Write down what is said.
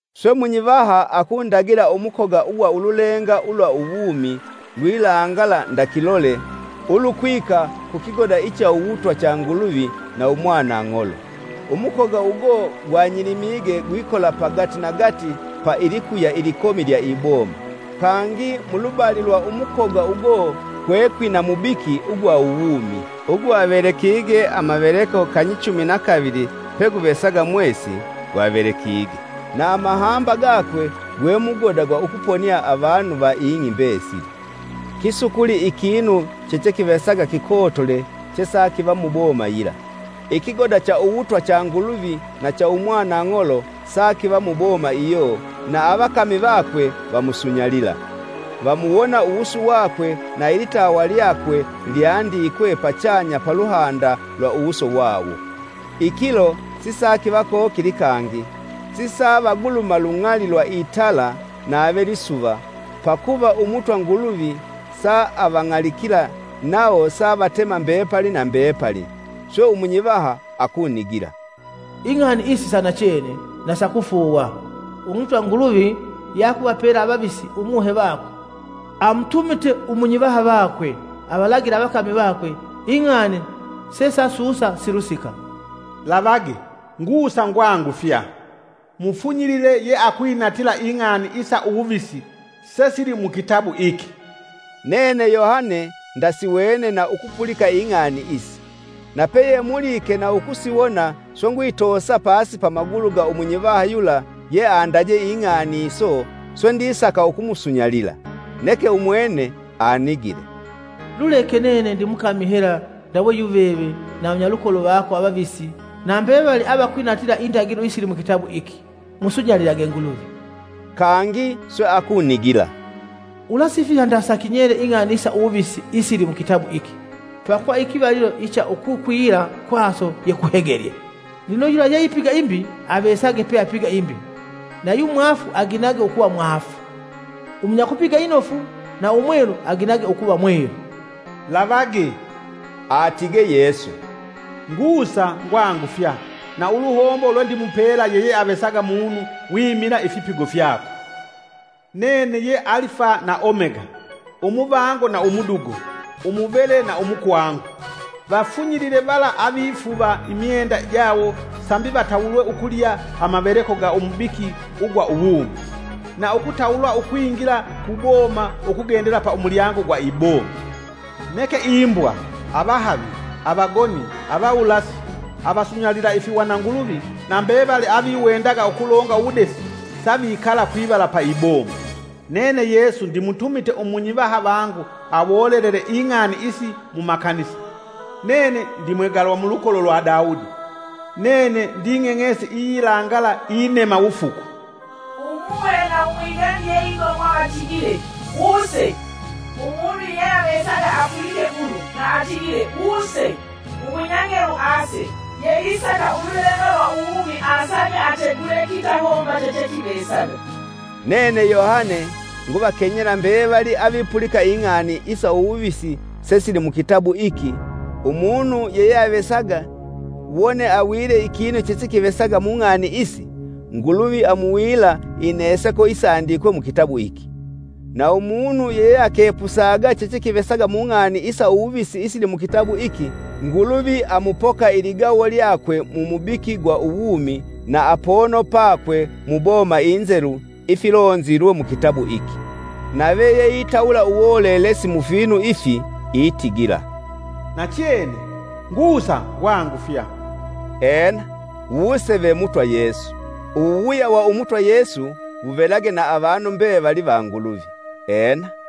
Swe munyivaha akundagila umukoga ugwa ululenga ulwa uwumi lwilangala nda kilole, ulwikwika ku kigoda icha uwutwa cha Nguluvi na Umwanang'olo. Umukoga ugo gwa nyilimige gwikola pagati na gati pa ilikuya ilikomi lya iboma kangi. Mulubali lwa umukoga ugo kwekwina mubiki ugwa uwumi ugwavelekige amaveleko kanyichumi na kavili peguvesaga mwesi, gwavelekige na amahamba gakwe gwe mugoda gwa ukuvaponia avanu va ing'i mbesili. Kisukuli ikinu chechekivesaga kikotole che sakiva muboma yila. Ikigoda cha uwutwa cha Nguluvi na cha Umwanang'olo sakiva muboma iyo na avakami vakwe vamusunyalila. Vamuwona uwusu wakwe na ilitawa lyakwe lyandikwe pachanya paluhanda lwa uwusu wawo. Ikilo sisakiva kokili kangi sivavaguluma lung'ali lwa itala nave lisuva pakuva Umutwa Nguluvi savang'alikila, nawo sa vatema mbepali na mbepali. Swe umunyivaha akunigila, “Ing'ani isi sa inachene na sakufuuwa, Umutwa Nguluvi yeakuvapela avavisi umuhe vakwe, amutumite umunyivaha vakwe avalagile avakami vakwe ing'ani sesasusa silusika. “Lavage! Ngusa ngwangufya. Mufunyilile yeakwinatila ing'ani isa uwuvisi sesili mukitabu iki.” Nene Yohane, ndasiwene na ukupulika ing'ani isi. Napeyemulike na ukusiwona swe ngwitoosa pasi pamagulu ga umunyivaha yula ye andaje ing'ani iso, swe ndisaka ukumusunyalila. Neke umwene anigile, “Luleke nene ndimukami hela ndawe yuveve na avanyalukolo vako avavisi na mbevali avakwinatila indagilo isili mukitabu iki. Musunyalilage Nguluvi!” Kangi swe akunigila, “Ulasifiha ndasa kinyele ing'ani isa uwuvisi isili mukitabu iki, pakuva ikivalilo icha ukukwila kwaso ye kuhegelye. Lino yula yeipiga imbi avesage peapiga imbi na yu mwaafu aginage ukuva mwaafu, umunyakupiga inofu na Umwelu aginage ukuva mwelu.” “Lavage!” Atige Yesu, “Ngusa ngwangufya, na uluhombo lwendimupela yeyeavesaga munu wimila ifipigo fyakwe. Nene ye Alifa na Omega, Umuvango na umudugo, umuvele na umukwangu.” Vafunyilile vala avifuva imyenda jawo sambi, vatawulwe ukulya amaveleko ga umubiki ugwa uwumi, na ukutawulwa ukwingila ku boma ukugendela pa umulyango gwa iboma. Neke imbwa, avahavi, avagoni, avawulasi, avasunyalila ifihwananguluvi na mbevali aviwendaga ukulonga uwudesi, savikala kwivala pa iboma. “Nene Yesu, ndimutumite umunyivaha vangu awolelele ing'ani isi mumakanisa. Nene ndimwegalwa mulukolo lwa Dawudi. Nene nding'eng'esi iyilangala inema wufuku.!” Umuhe na Umwigani yeigomwa vatigile! “Wuse.” Umunu yeyeavesaga apulike ulu, na atigile, “Wuse.” Umunya ng'elu ase, yeisaka ululenga lwa uwumi asage ategule kitahomba chechekivesaga. Nene Yohane nguvakenyela mbevali avipulika ing'ani isa uwuvisi sesili mukitabu iki, umunu yeyeavesaga wone awile ikinu chechekivesaga mung'ani isi, Nguluvi amuwila ineseko isandikwe mukitabu iki. Na umunu yeyeakepusaga chechekivesaga mung'ani isa uwuvisi isili mukitabu iki Nguluvi amupoka iligawo lyakwe mu mubiki gwa uwumi na apono pakwe mu boma inzelu, ifilonge mukitabu iki. Nave yeitawula uwolelesi mufinu ifi itigila, “Nachene! Ngusa ngwangufya.” Ena! Wuse ve Mutwa Yesu! Uwuwuya wa Umutwa Yesu wuvelage na avanu mbevali va Nguluvi. Ena!